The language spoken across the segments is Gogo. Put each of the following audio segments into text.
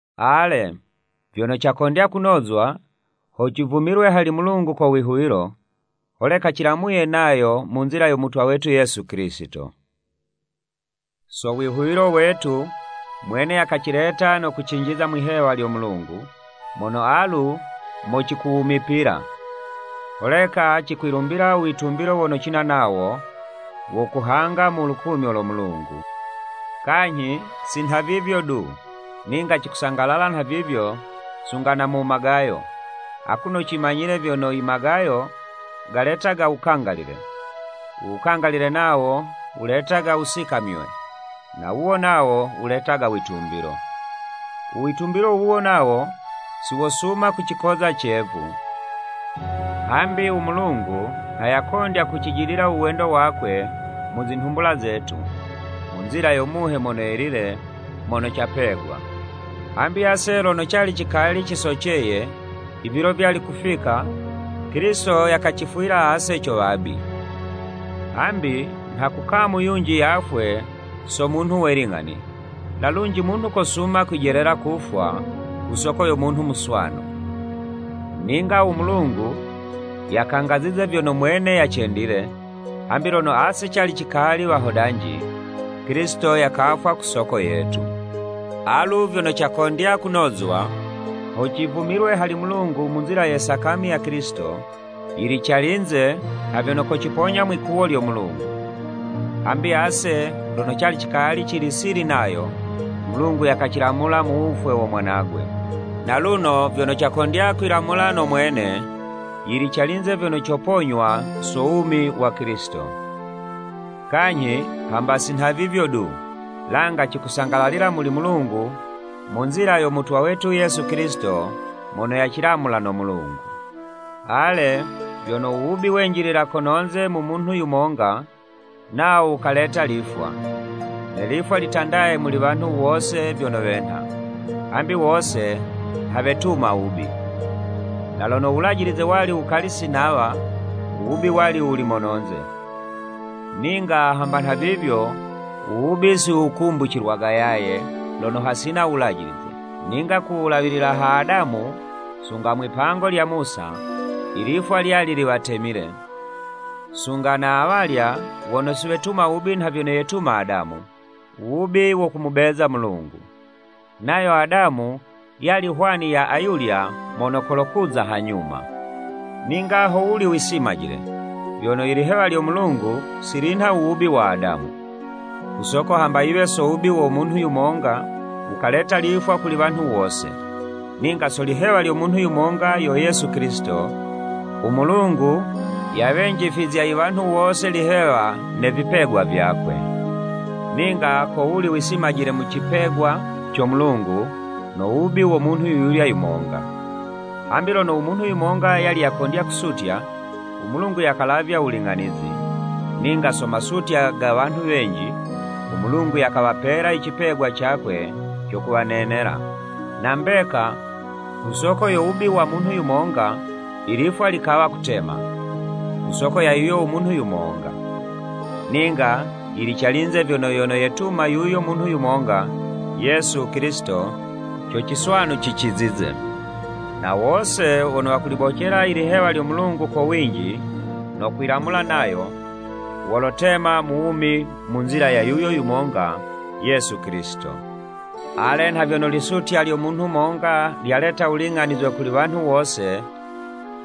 Ale, vyono cakondya kunozwa, ho civumilwe hali Mulungu ko wihuwilo, holeka cilamuye nayo mu nzila yo mutwa wetu Yesu Kilisito. So wihuwilo wetu, mwene yakacileta no kucinjiza mwi'hewa lyo Mulungu, mono alu mo cikuwumipila. Holeka cikwilumbila u witumbilo wono cina nawo, wo kuhanga mu lukumyo lo Mulungu. Kanyhi si nhavivyo du, ninga cikusangalala nhavivyo sunga na mu magayo, akuno cimanyile vyono imagayo galetaga wukangalile, u wukangalile nawo wuletaga wusikamywe, na wuwo nawo wuletaga witumbilo. U witumbilo wuwo nawo si wosuma kucikoza cevu, hambi u Mulungu, nha yakondya kucijidila u wendo wakwe mu zinhumbula zetu, mu nzila yo Muhe Mono Yelile mono capegwa. Hambi ase lono cali cikali cisoceye, ivilo vyali kufika, Kilisito yakacifwila ase co wabi. Hambi nha kukamu yunji yafwe so munhu we ling'ani, na lunji munhu kosuma kwijelela kufwa ku soko yo munhu muswanu. Ninga u Mulungu yakangazize vyono mwene yacendile, hambi lono ase cali cikali wahodanji, Kilisito yakafwa ku soko yetu. Alu vyono cakondya kunozwa, ho civumilwe hali Mulungu mu nzila ye sakami ya Kilisito, yili calinze, nha vyono kociponya mwi'kuwo lyo Mulungu. Hambi ase lono cali cikali cili sili nayo, u Mulungu yakacilamulila mu wufwe wo mwanagwe. Naluno vyono cakondya kwilamula no mwene, yili calinze vyono coponywa so wumi wa Kilisito. Kanyhi hamba si nhavivyo du, langa cikusangalalila muli Mulungu mu nzila yo Mutwa wetu Yesu Kilisito mono yacilamula no Mulungu. Ale, vyono u wubi wenjilila kono'nze ko munhu yumonga, nawo wukaleta lifwa. Ne lifwa litandaye muli wanhu wose vyono wenha, hambi wose nha wetuma wubi. Na lono u Wulajilize wali wukali si nawa, u wubi wali wuli mono'nze, ninga hamba nhavivyo, u wubi si wukumbucilwaga yaye lono hasina u Wulajilize. Ninga ku wulawilila ha Adamu, sunga mwipango lya Musa, ilifwa lyali liwatemile, sunga na awalya wono si wetuma wubi nha vyono yetuma Adamu, u wubi wo kumubeza u Mulungu. Nayo Adamu, yali hwani ya ayulya mono kolokuza hanyuma. Ninga ho wuli wisimajile; vyono i lihewa lyo Mulungu si linha u wubi wa Adamu. Ku soko hamba yiwe so wubi wa munhu yumonga wukaleta lifwa kuli wanhu wose, ninga so lihewa lya munhu yumonga yo Yesu Kilisito, u Mulungu yawenjifizya iwanhu wose ilihewa ne vipegwa vyakwe. Ninga kowuli wisimajile mu cipegwa co Mulungu, no wubi wo munhu yuyulya yumonga. Hambi lono u munhu yumonga yali yakondya kusutya, u Mulungu yakalavya wuling'anizi, ninga so masutya ga wanhu wenji, u Mulungu yakawapela icipegwa cakwe co kuwanenela. Na mbeka, ku soko yo wubi wa munhu yumonga, ilifwa likawa kutema, ku soko ya yuyo umunhu yumonga. Ninga yili calinze vyono yono yetuma yuyo munhu yumonga, Yesu Kilisito, co ciswanu cicizize. Na wose wono wakulibocela ilihewa lyo Mulungu ko winji, no kwilamula nayo, wolotema mu wumi mu nzila ya yuyo yumonga, Yesu Kilisito. Ale, nha vyono lisutya lyo munhu monga lyaleta wuling'anizwe kuli wanhu wose,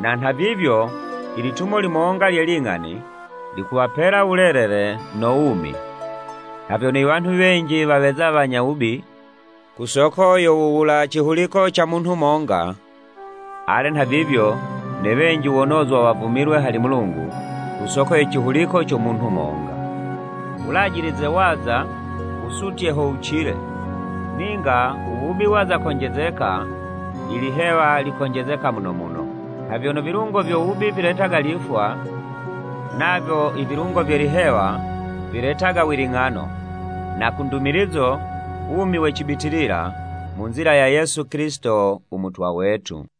na nhavivyo, ilitumo limonga lye ling'ani, likuwapela wulelele no wumi. Nha vyono iwanhu wenji waweza wanya wubi, ku soko yo wula cihuliko ca munhu monga, ale nhavivyo, ne wenji wonozwa wavumilwe hali Mulungu, ku soko ye cihuliko co munhu monga. U Wulajilize waza, wusutye ho wucile, ninga u wubi waza konjezeka, ilihewa likonjezeka muno muno. Nha vyono ivilungo vyo wubi, viletaga lifwa, navyo ivilungo vye lihewa viletaga wiling'ano, na kundumilizo, wumi we cibitilila mu nzila ya Yesu Kilisito u Mutwa wetu.